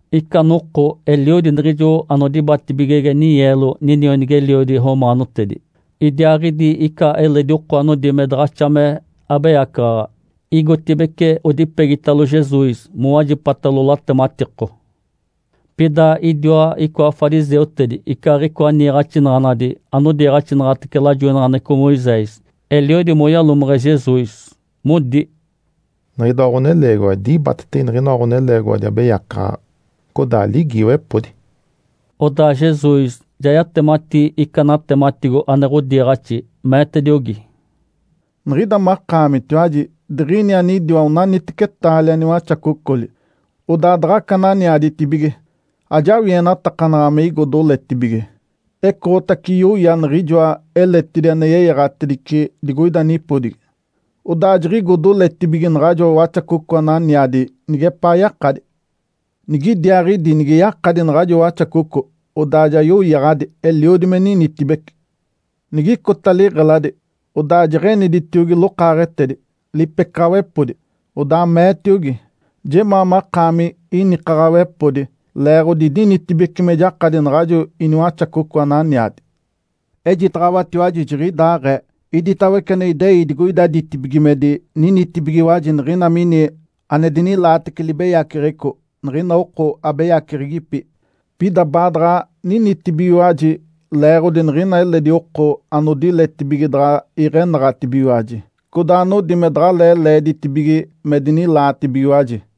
Ica noko eliodi niɡ̶ijo anodibatibigege ninyeelo ninionigi-eliodi romaanotedi, idiaaɡ̶idi ica eledi oko anodi me daɡ̶axa me abeyacaɡ̶aɡ̶a, igotibeci odipegitalo Jesus mowajipatalo latematiko. Pida idiwa icoa fariseutedi, icaaɡ̶icoa niiɡ̶axinaɡ̶anadi anodiiɡ̶axinaɡ̶atece lajoinaɡ̶aneɡ̶eco Moisés, eliodi moyalomeɡ̶e Jesus, modi, “Niɡ̶idoa ɡ̶oneleegiwa dibatetege niɡ̶inoa ɡ̶oneleegiwadi abeyacaɡ̶aɡ̶a, codaa ligiiwepodi.” Odaa Jesus ja yatemati ica natematigo ane ɡ̶odiiɡ̶axi, meetediogi, “Niɡ̶ida makaamitiwaji diɡ̶ini anidiwa onaniteci taalia niwaxacocoli, odaa daɡ̶aca ananiaditibige. Ajawienatakanaɡ̶a me igo doletibige, ecoɡ̶otace yoya niɡ̶ijoa eletidi ane yeyaɡ̶atedice digoida nipodigi. Odaa jiɡ̶igo doletibige naɡ̶ajo waxacoco ananiadi nigepaa yakadi. Nigidiaaɡ̶idi nige yakadi naɡ̶ajo waxacoco, odaa ja yoyaɡ̶adi, eliodi me ninitibece. Nigicota liɡ̶eladi, odaa jeɡ̶eniditiogi lokaaɡ̶etedi, lipecaɡ̶awepodi, odaa meetiogi, ‘Jemaa makaami inikaɡ̶awepodi, leeɡ̶odi idinitibeci me jakadi naɡ̶ajo iniwaxacoco ananiadi.’ Ejitaɡ̶awatiwaji jiɡ̶idaaɡ̶ee, iditawece ane idei digoida ditibigimedi ninitibigiwaji niɡ̶ina mini ane dinilaatece libeyaceɡ̶eco niɡ̶ina oko abeyaceɡ̶egipi, pida baadaɡ̶a ninitibigiwaji leeɡ̶odi niɡ̶ina eledi oko anodiletibige daɡ̶a iɡ̶enaɡ̶atibigiwaji, codaa anodi me daɡ̶alee leeditibige me dinilaatibigiwaji.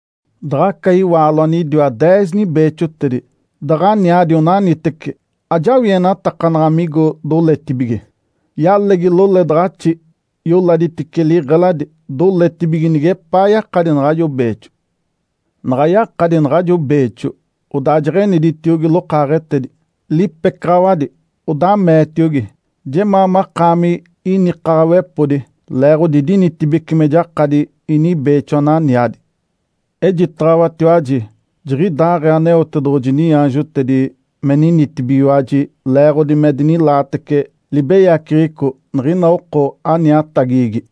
Daɡ̶a aca iwaalo anidiwa deez nibeexotedi daɡ̶aniadi onaniteci, ajawienatakanaɡ̶a migo doletibige. Yalegi loledaɡ̶axi, yoladitice liɡ̶eladi, doletibige nigepaa yakadi naɡ̶ajo beexo. Naɡ̶a yakadi naɡ̶ajo beexo, odaa jeɡ̶eniditiogi lokaaɡ̶etedi, lipecaɡ̶awadi, odaa meetiogi, ‘Jemaa makaami inikaɡ̶awepodi leeɡ̶odi idinitibeci me jakadi inibeexo ananiadi.’ Ejitaɡ̶awatiwaji, jiɡ̶idaaɡ̶ee Aneotedoɡ̶oji niaanjotedi me ninitibigiwaji leeɡ̶odi me dinilaatece libeyaceɡ̶eco niɡ̶ina oko aniatagigi.”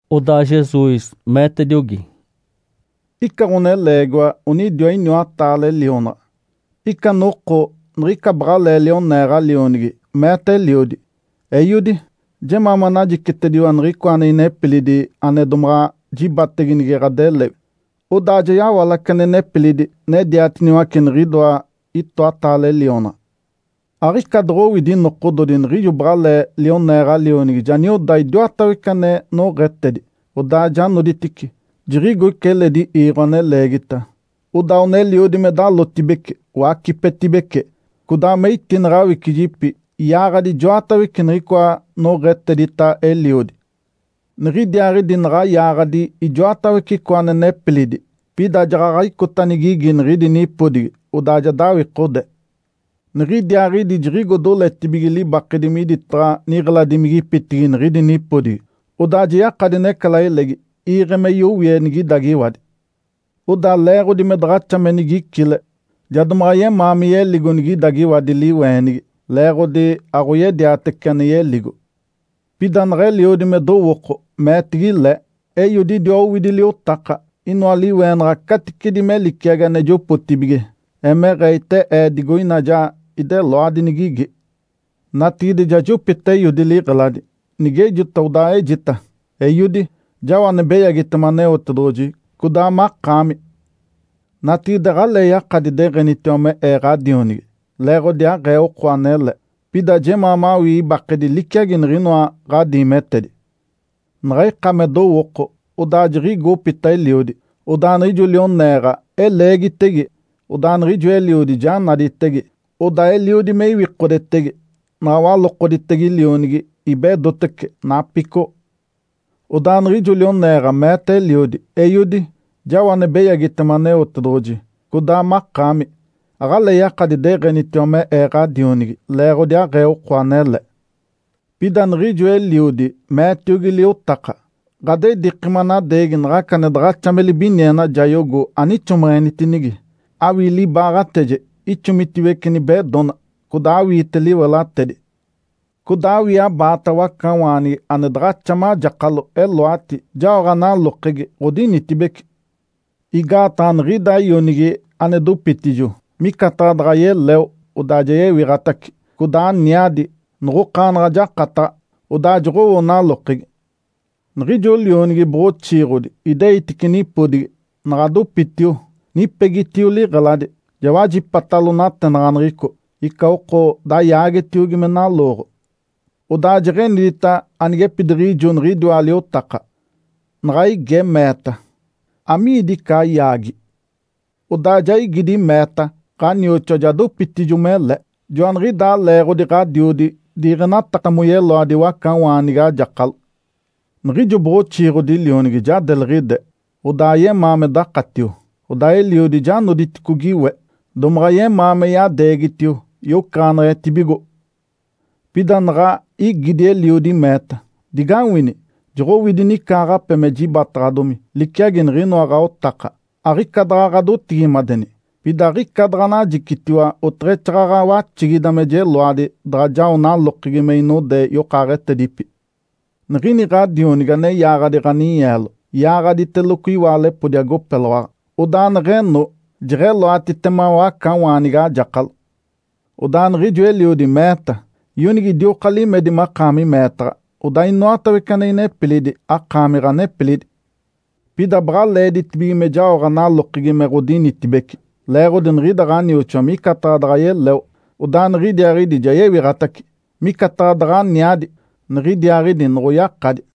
Odaa Jesus meetetiogi, “Ica ɡ̶oneleegiwa onidiwa iniwataale lionaɡ̶a. Ica noko niɡ̶ica baɡ̶alee lioneeɡ̶a lionigi meeta eliodi, ‘Eiodi, jemaa manajicitediwa niɡ̶icoa ane inepilidi ane domaɡ̶a jibatege nige ɡ̶adelewi.’ Odaa ja yawalace ane nepilidi nediatiniwace niɡ̶idoa itoataale lionaɡ̶a. Aɡ̶ica doɡ̶owidi nokododi niɡ̶ijo baɡ̶alee lioneeɡ̶a lionigi ja nioda idiwatawece ane noɡ̶etedi, odaa ja noditice, jiɡ̶igo ica eledi iiɡ̶o ane leegita. Odaa oneliodi me dalotibece, wacipetibece, codaa me itineɡ̶e awicijipi, yaaɡ̶adi ijoatawece niɡ̶icoa noɡ̶etedita eliodi. Niɡ̶idiaaɡ̶idi naɡ̶a yaaɡ̶adi ijoatawece icoa ane nepilidi, pida jaɡ̶aɡ̶a icota nigigi niɡ̶idi nipodigi. Odaa ja dawikode. Niɡ̶idiaaɡ̶idi jiɡ̶igo doletibige libakedi miditaɡ̶a niɡ̶eladimigipitigi niɡ̶idi nipodigi, odaa ja yakadi necalailegi iiɡ̶e me yowie nigidagiwadi. Odaa leeɡ̶odi me daɡ̶axa me nigicile, ja domaɡ̶a yemaa me yeligo nigidagiwadi liweenigi, leeɡ̶odi aɡ̶oyediatece ane yeligo. Pida naɡ̶a eliodi me dowooko, meetigi le, ‘Eiodi idiwa owidi liotaka, inoa liweenaɡ̶a caticedi me liciagi ane jopotibige, emeɡ̶ee ite ee digoina ja ideloadi nigigi. Natigide ja jopita eiodi liɡ̶eladi. Nigejota, odaa ejita, “Eiodi, jao ane beyagitema Aneotedoɡ̶oji, codaa makaami. Natigide aɡ̶alee yakadi deɡ̶enitiwa me ee ɡ̶adionigi, leeɡ̶odi aɡ̶ee oko anele. Pida jemaa mawii ibakedi liciagi niɡ̶inoa ɡ̶adiimetedi.” ’ Naɡ̶a ika me dowooko, odaa jiɡ̶igo opita eliodi. Odaa niɡ̶ijo lioneeɡ̶a eleegitege, odaa niɡ̶ijo eliodi ja naditege. Odaa eliodi me iwikodetege. Naɡ̶a walokoditege lionigi, ibedotece, napicoɡ̶o. Odaa niɡ̶ijo lioneeɡ̶a meeta eliodi, ‘Eiodi, jao ane beyagitema Aneotedoɡ̶oji, codaa makaami. Aɡ̶alee yakadi deɡ̶enitiwa me ee ɡ̶adionigi, leeɡ̶odi aɡ̶ee oko anele.’ Pida niɡ̶ijo eliodi, meetiogi liotaka, ‘Ǥadediiki manadeegi naɡ̶aca ane daɡ̶axa me libiniena jayogo anixomeɡ̶enitinigi. Awii libaaɡ̶ateje ixomitiwece nibedona, codaa awiite liwelatedi. Codaa awii abaata wacawaanigi ane daɡ̶axa majakalo, eloati, jaoɡ̶a nalokegi, ɡ̶odinitibece. Igaataɡ̶a niɡ̶ida ionigi ane dopitijo, micataɡ̶a daɡ̶a yeleo, odaa ja yewiɡ̶atace, codaa aniadi, noɡ̶okaanaɡ̶a jakataɡ̶a.’ Odaa joɡ̶owo nalokegi. Niɡ̶ijo lionigi boɡ̶oxiiɡ̶odi ideitice nipodigi, naɡ̶a dopitio, niɡ̶ipegitio liɡ̶eladi, ja wajipatalo natenaɡ̶aneɡ̶eco, ica oko dayaagetiogi me nalooɡ̶o. Odaa jeɡ̶enidita anigepidiɡ̶ijo niɡ̶idiwa liotaka, naɡ̶a ige, meeta, ‘Amiidi ica ayaagi?’ Odaa ja igidi, meeta, ‘Ǥanioxoa ja dopitijo, mele. Joaniɡ̶idaa leeɡ̶odi ɡ̶adiodi diiɡ̶enataka moyeloadi wacawaanigi ajakalo.’ Niɡ̶ijo boɡ̶oxiiɡ̶odi lionigi ja deliɡ̶ide, odaa ayemaa me dakatio. Odaa eliodi ja noditicogi we, domaɡ̶a yemaa me yadeegitio, yocaɡ̶aneɡ̶etibigo. Pida naɡ̶a igidi eliodi, meeta, ‘Digawini! Joɡ̶owidi nicaaɡ̶ape me jibataɡ̶adomi, liciagi niɡ̶inoa ɡ̶aotaka. Aɡ̶ica daɡ̶a ɡ̶adotigimadeni. Pida aɡ̶ica daɡ̶anajicitiwa oteɡ̶exaaɡ̶aɡ̶a waxigida me jeloadi daɡ̶a jao nalokegi me inode yokaaɡ̶etedipi. Niɡ̶ini ɡ̶adionigi ane yaaɡ̶adi ɡ̶aninyeelo, yaaɡ̶aditeloco iwaalepodi agopeloaɡ̶a, odaa neɡ̶eno, jeɡ̶eloatitema wacawaanigi ajakalo.’ Odaa niɡ̶ijo eliodi meeta, ‘Ionigi, idioka limedi makaami meetaɡ̶a. Odaa inoatawece ane inepilidi, akaami ɡ̶anepilidi. Pida baɡ̶a leeditibige me jaoɡ̶a nalokegi me ɡ̶odinitibece. Leeɡ̶odi niɡ̶ida ɡ̶anioxoa micataɡ̶a daɡ̶a yeleo, odaa niɡ̶idiaaɡ̶idi ja yewiɡ̶atace. Micataɡ̶a daɡ̶aniadi, niɡ̶idiaaɡ̶idi noɡ̶oyakadi!’”